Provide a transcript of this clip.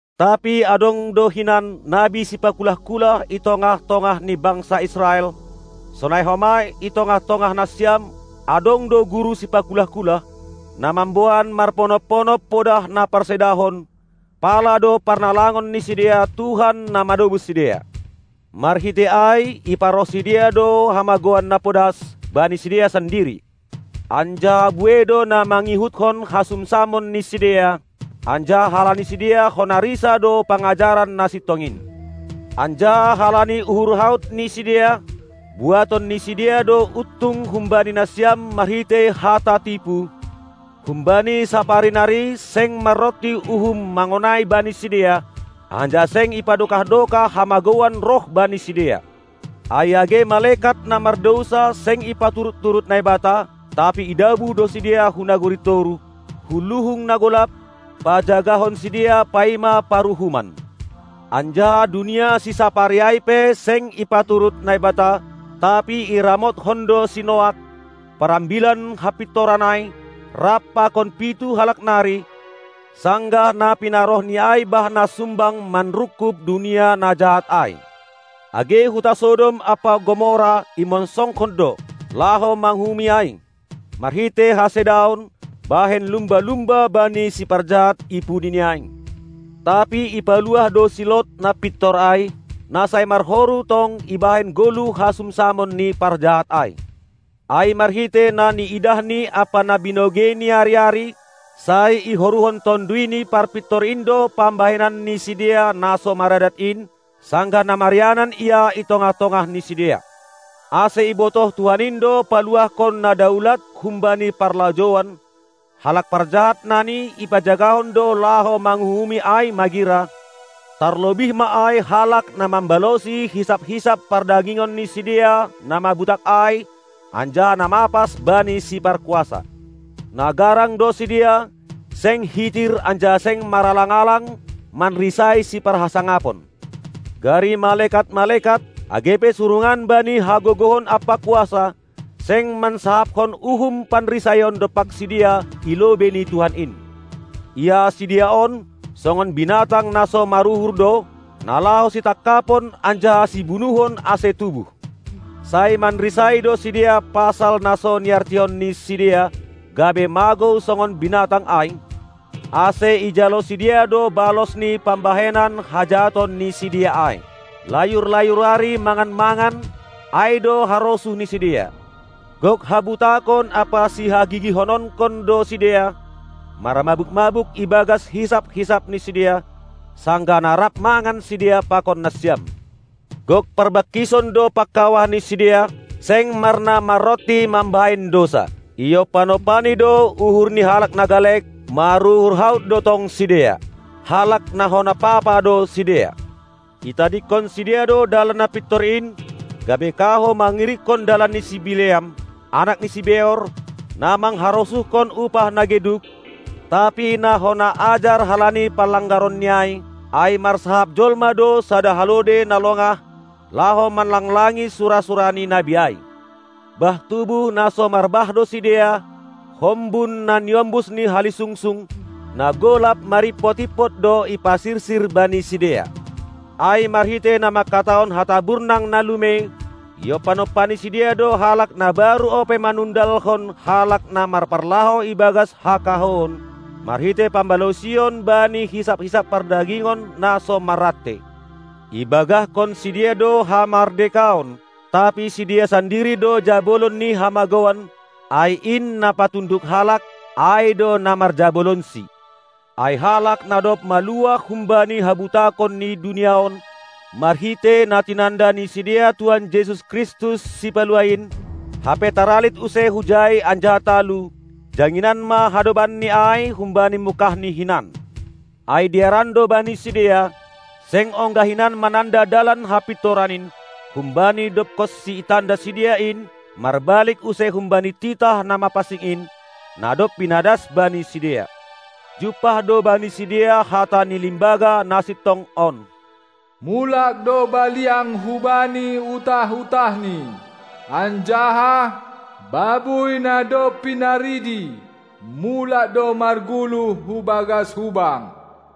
Tapi adong do hinan nabi sipakulah-kulah i tongah-tongah ni bangsa Israel; sonai homa i tongah-tongah nasiam adong do guru sipakulah-kulah, na mamboan marponop-ponop podah na parsedahon, pala do parnalangon ni sidea Tuhan na manobus sidea. Marhitei ai iparoh sidea do hamagouan na podas bani sidea sandiri. Anjaha buei do na mangihuthon hasumsamon ni sidea, anjaha halani sidea hona risa do pangajaran na sintong in. Anjaha halani uhur haut ni sidea, buaton ni sidea do untung humbani nasiam marhitei hata tipu; humbani sapari nari seng maronti uhum mangonai bani sidea, anjaha seng ipadokah-dokah hamagouan roh bani sidea. Ai age malekat na mardousa seng ipaturut-turut Naibata, tapi idabuh do sidea hu nagori toruh, hu luhung na golap, pajagahon sidea paima paruhuman. Anjaha dunia sisapari ai pe seng ipaturut Naibata; tapi iramothon do si Noak, parambilan hapintoran ai, rap pakon pitu halak nari, sanggah na pinarohNi ai bah na sumbang manrungkub dunia na jahat ai. Age huta Sodom ampa Gomora imonsongkon do, laho manguhumi ai, marhitei hasedaon, bahen lumba-lumba bani siparjahat i pudini ai; tapi ipaluah do si Lot na pintor ai, na sai marhoru tong ibahen goluh hasumsamon ni parjahat ai. Ai marhitei na niidahni ampa na binogeini ari-ari, sai ihoruhon Tonduy ni Parpintor in do pambahenan ni sidea na so maradat in, sanggah na marianan ia i tongah-tongah ni sidea. Ase ibotoh Tuhan in do paluahkon na daulat humbani parlajouan, halak parjahat nani ipajagahon do laho manguhumi ai magira, tarlobih ma ai halak na mambalosi hisap-hisap pardagingon ni sidea na mabutak ai anjaha na mapas bani si parkuasa. Na garang do sidea, seng hitir anjaha seng maralang-alang manrisai siparhasangapon. Gari malekat-malekat, age pe surungan bani hagogohon ampa kuasa, seng mansahapkon uhum panrisaion dompak sidea i lobei ni Tuhan in. Ia sidea on, songon binatang na so maruhur do, na laho sitangkapon anjaha sibunuhon ase tubuh. Sai manrisai do sidea pasal na so niartihon ni sidea, gabe magou songon binatang ai; ase ijalo sidea do balos ni pambahenan hajahaton ni sidea ai. Layur-layur ari mangan-mangan, ai do harosuh ni sidea; gok habutakon ampa sihagigihononkon do sidea, marmabuk-mabuk ibagas hisap-hisap ni sidea, sanggah na rap mangan sidea pakon nasiam. Gok parbangkison do pangkawah ni sidea, seng marnamaronti mambahen dousa. Iompan-ompani do uhur ni halak na galek, maruhur haut do tong sidea. Halak na hona papa do sidea. Itadingkon sidea do dalan na pintor in, gabe kahou mangirikkon dalan ni si Bileam, anak ni si Beor, na mangharosuhkon upah na geduk, tapi na hona ajar halani panlanggaronni ai, ai marsahap jolma do sada halode na longah, laho manlanglangi sura-sura ni nabi ai. Bah tubuh na so marbah do sidea, hombun na niombus ni halisungsung; na golap marimpot-impot do iparsirsir bani sidea. Ai marhitei na manghatahon hata burnang na lumei, iompan-ompani sidea do halak na baru ope manundalhon halak na marparlahou ibagas hakahouon, marhitei pambalosion bani hisap-hisap pardagingon na so marrantei. Ibagahkon sidea do hamardekaon, tapi sidea sandiri do jabolon ni hamagouan; ai in na patunduk halak, ai do na marjabolonsi. Ai halak na dob maluah humbani habutakon ni dunia on, marhitei na tinanda ni sidea Tuhan Jesus Kristus, Sipaluah in, hape taralit use hujai anjaha talu, janginan ma hadobanni ai humbani mungkahni hinan. Ai dearan do bani sidea, seng ongga hinan mananda dalan hapintoran in, humbani dobkonsi itanda sidea in, marbalik use humbani titah na mapansing in, na dob pinadas bani sidea. Jumpah do bani sidea hata ni limbaga na sintong on: "Mulak do baliang hubani utah-utahni, " anjaha "babuy na dob pinaridi mulak do margulu hu bagas hubang."